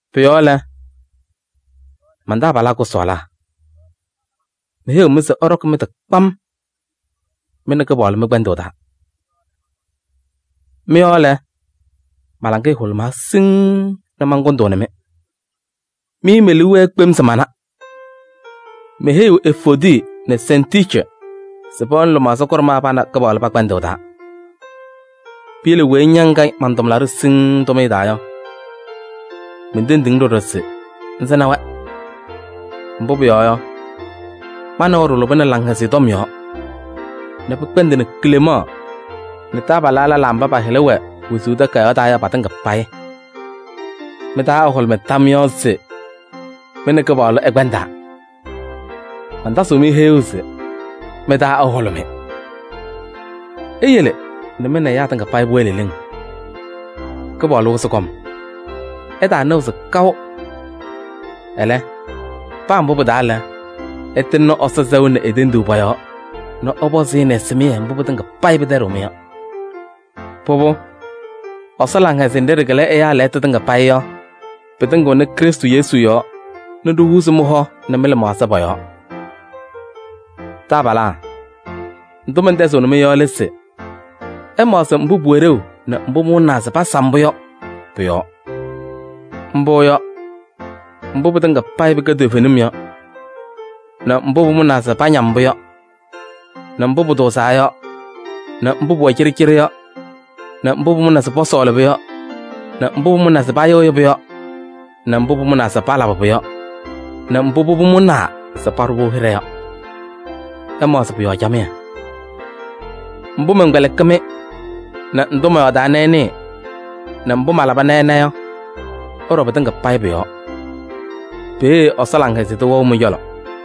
Pʋ-yɔɔ lɛ, man-taabalaa kʋsɔɔlaa! Meheyiɣ-mɩ se ɩɖɔkɩ mɩ-tɩ kpam mɩ nɛ Kɩpaɣlʋ mɩ-kpɛndʋʋ taa. Mɩ-yɔɔ lɛ, ma-laŋɩyɛ hʋlʋmaa siŋŋ nɛ mankʋndʋʋnɩ-mɩ. Mɩ me-liu wɛɛ kpem se mana. Meheyiɣ Evoodi nɛ Sɛntiici se pɛwɛnɩ lɩmaɣza kʋɖʋmɛɛ pa nɛ Kɩpaɣlʋ pɛ-kpɛndʋʋ taa. Piyele weyi ña ŋkɛ man-taabalʋ siŋŋ tʋmɩyɛ taa yɔ, mentendiɣ-ŋ ɖɔɖɔ se ŋsɩnɩ-wɛ. Mbʋ pʋyɔɔ yɔ, ma nɛ wɛ ɖɩlʋbɩnɩ Laŋhɛzɩyɛ Tɔm yɔɔ nɛ pɩkpɛndɩnɩ Klemaɣ nɛ taabalaa lɛlaa mba pa-hɩla wɛ wezuu takayaɣ taa yɔ patɩŋa payɩ. Mɩ-taa ɛhʋlʋmɩ tam yɔɔ se mɩ nɛ Kɩpaɣlʋ ɩkpɛndaa. Mantasɩɣ-mɩ heyuu se: mɩ-taa ɛhʋlʋmɩ! Iyele nɛ mɩ nɛ ɛyaa tɩŋa pʋwɛɛ leleŋ, Kɩpaɣlʋ wɩzɩ kɔm. Ɩtaanɩɣzɩ kaʋ. Ɛlɛ, paa mbʋ pɩ-taa lɛ, ɩtɩŋnɩ Ɛsɔ sɛʋ nɛ e-tenduu pɔ-yɔɔ nɛ ɛpɔzɩ-ɩ nɛ ɛsɩmɩyɛ mbʋ pɩtɩŋa pɩtɛɖɩɣ-mɩ yɔ. Pʋbʋ, Ɛsɔ laŋhɛzɩyɛ nɖɩ ɖɩkɩlɩ ɛyaa lɛɣtʋ tɩŋa payɩ yɔ, pɩtɩŋɩɣnɩ Krɩstʋ Yesu yɔɔ nɛ ɖihuuzi mɩ-hɔ nɛ mɩ-lɩmaɣza pɔ-yɔɔ. Taabalaa! Ndʋ mɛntɛzɩɣnɩ-mɩ yɔ lɛ se: ɩmaɣzɩ mbʋ pʋwɛ ɖeu nɛ pʋmʋna se pasam-pʋ yɔ pʋ-yɔɔ. Mbʋ yɔ: mbʋ pɩtɩŋa payɩ pɩkɛ toovenim yɔ nɛ mbʋ pʋmʋnaa se pañam-pʋ yɔ nɛ mbʋ pʋtʋʋzaa yɔ nɛ mbʋ pʋwɛ cɩɖɩcɩɖɩ yɔ nɛ mbʋ pʋmʋnaa se pɔsɔɔlɩ-pʋ yɔ nɛ mbʋ pʋmʋnaa se payɩɣyɩ-pʋ yɔ nɛ mbʋ pʋmʋnaa se palabɩ-pʋ yɔ nɛ mbʋ pʋbʋ mʋnaa se paɖʋ-pʋ hɩɖɛ yɔ. Ɩmaɣzɩ pʋ-yɔɔ camɩyɛ. Mbʋ mɛnkpɛlɩkɩ-mɩ nɛ ndʋ mɔyɔɔdaa nɛ ɩnɩɩ nɛ mbʋ malaba nɛ ɩna yɔ, ɩɖɔ pɩtɩŋa payɩ pʋ-yɔɔ. Peeye Ɛsɔ laŋhɛzɩyɛ tʋ wɛɣ mɩ-cɔlɔ.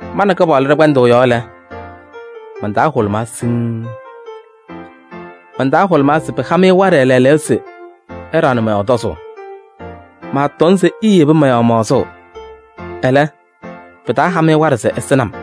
Ma nɛ Kɩpaɣlʋ ɖɛ-kpɛndʋʋ yɔɔ lɛ, man-taa hʋlʋmaa siŋŋ. Man-taa hʋlʋmaa se pɩha-mɩ waɖɛ lɛɛlɛɛyɔ se ɩɖaɣnɩ mɔ-yɔɔ tɔzʋʋ. Maatɔŋ se iiyebi mɔ-yɔɔ maɣzʋʋ, ɛlɛ, pɩtaaha-mɩ waɖɛ se ɩsɩnɩ-m.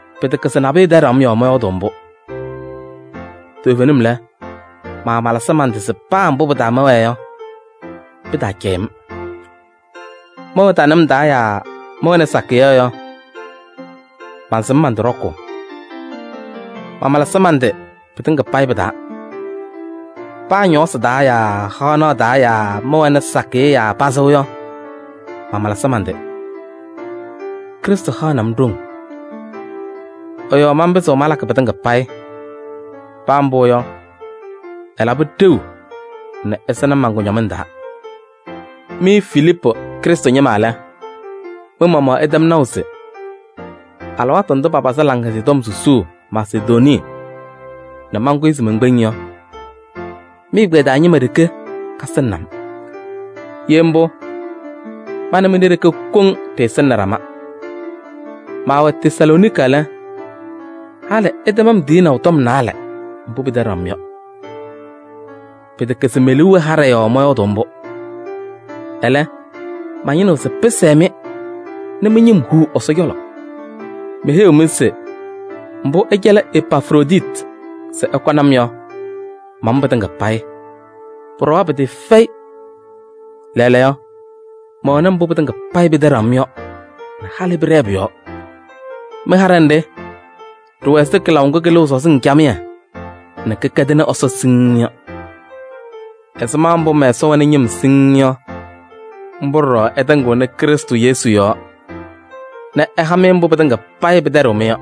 Pɩtɛkɛ se nabʋyʋ tɛɖɩɣ-m yɔɔ mɔyɔɔdʋʋ mbʋ. Toovenim lɛ, mamalɩsɩ man-tɩ se pa mbʋ pɩ-taa mɛwɛɛ yɔ, pɩtaacɛyɩ-m. Mɛwɛ tanɩm taa yaa mɛwɛnɩ sakɩyɛ yɔ, mansɩm man-tɩ ɖɔkʋʋ. Mamalɩsɩ man-tɩ pɩtɩŋa payɩ pɩ-taa: paa ñɔɔsɩ taa yaa haɣnaɣ taa yaa mɛwɛnɩ sakɩyɛ yaa pazɩ yɔ, mamalɩsɩ man-tɩ. Krɩstʋ haɣnɩ-m ɖoŋ, ɛ-yɔɔ manpɩzɩɣ malakɩ pɩtɩŋa payɩ. Paa mbʋ yɔ, ɩlabɩ ɖeu nɛ ɩsɩnɩ-m man-kʋñɔmɩŋ taa. Mɩ Filiipu Krɩstʋ ñɩma lɛ, mɩ-maɣmaɣ ɩtɛm naʋ se: alɩwaatʋ ndʋ papazɩ Laŋhɛzɩyɛ Tɔm susuu Masedonii nɛ mankʋyɩ se menkpeŋ yɔ, mɩ-ɛgbɛyɛ taa ñɩma ɖeke kasɩnɩnɩ-m. Ye mbʋ, ma nɛ mɩ ɖe-ɖeke koŋ ɖɩsɩnɩnɩ ɖama. Maawɛ Tesalooniki lɛ, halɩ ɩtɛm-m tiyinaʋ tɔm naalɛ mbʋ pɩtɛɖaɣ-m yɔ. Pɩtɛkɛ se me-liu wɛ haɖɛ yɔɔ mɔyɔɔdʋʋ mbʋ. Ɛlɛ, mañɩnɩɣ se pɩsɛɛ-mɩ nɛ mɩ-ñɩm huu Ɛsɔ cɔlɔ. Meheyiɣ-mɩ se mbʋ ɩcɛlɩ Epafroditi se ɛkɔnɩ-m yɔ, mamʋ pɩtɩŋa payɩ. Pʋɖɔwa pɩtɩɩfɛyɩ. Lɛɛlɛɛyɔ, mɛwɛnɩ mbʋ pɩtɩŋa payɩ pɩtɛɖaɣ-m yɔ nɛ halɩ pɩɖɛɛ pʋ-yɔɔ. Mɩ-haɖɛ nɖɩ ɖɩwɛ ɛzɩ kɩlaʋ ŋgʋ kɩlɩɣ sɔzɩŋ camɩyɛ nɛ kɩkɛdɩnɩ Ɛsɔ siŋŋ yɔ. Ɛzɩma mbʋ mɛ-Ɛsɔ wɛnɩ ñɩm siŋŋ yɔ, mbʋ ɖɔɖɔ ɛtɩŋɩɣnɩ Krɩstʋ Yesu yɔɔ nɛ ɛha-mɩ mbʋ pɩtɩŋa payɩ pɩtɛɖɩɣ-m yɔ.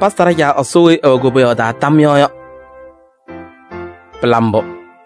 Pasa ɖa-Caa Ɛsɔ weyi ɛwɛ koboyaɣ taa tam yɔɔ yɔ. Pɩla mbʋ!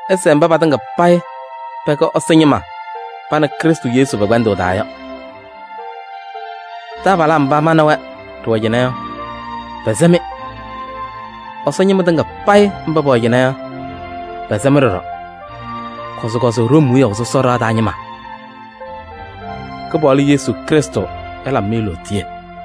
Ɩsɛɛ mba patɩŋa payɩ pɛkɛ Ɛsɔ ñɩma pa nɛ Krɩstʋ Yesu pɛ-kpɛndʋʋ taa yɔ. Taabalaa mba ma nɛ wɛ ɖɩwɛɛ yɔ, pɛsɛ-mɩ. Ɛsɔ ñɩma tɩŋa payɩ mba pɛwɛ cɩnɛ yɔ, pɛsɛ-mɩ ɖɔɖɔ. Kɔzɩkɔzɩ Room wiyaʋ sɔsɔ ɖɩɣa taa ñɩma. Kɩpaɣlʋ Yesu Krɩstʋ ɛlabɩ-mɩ lootiye.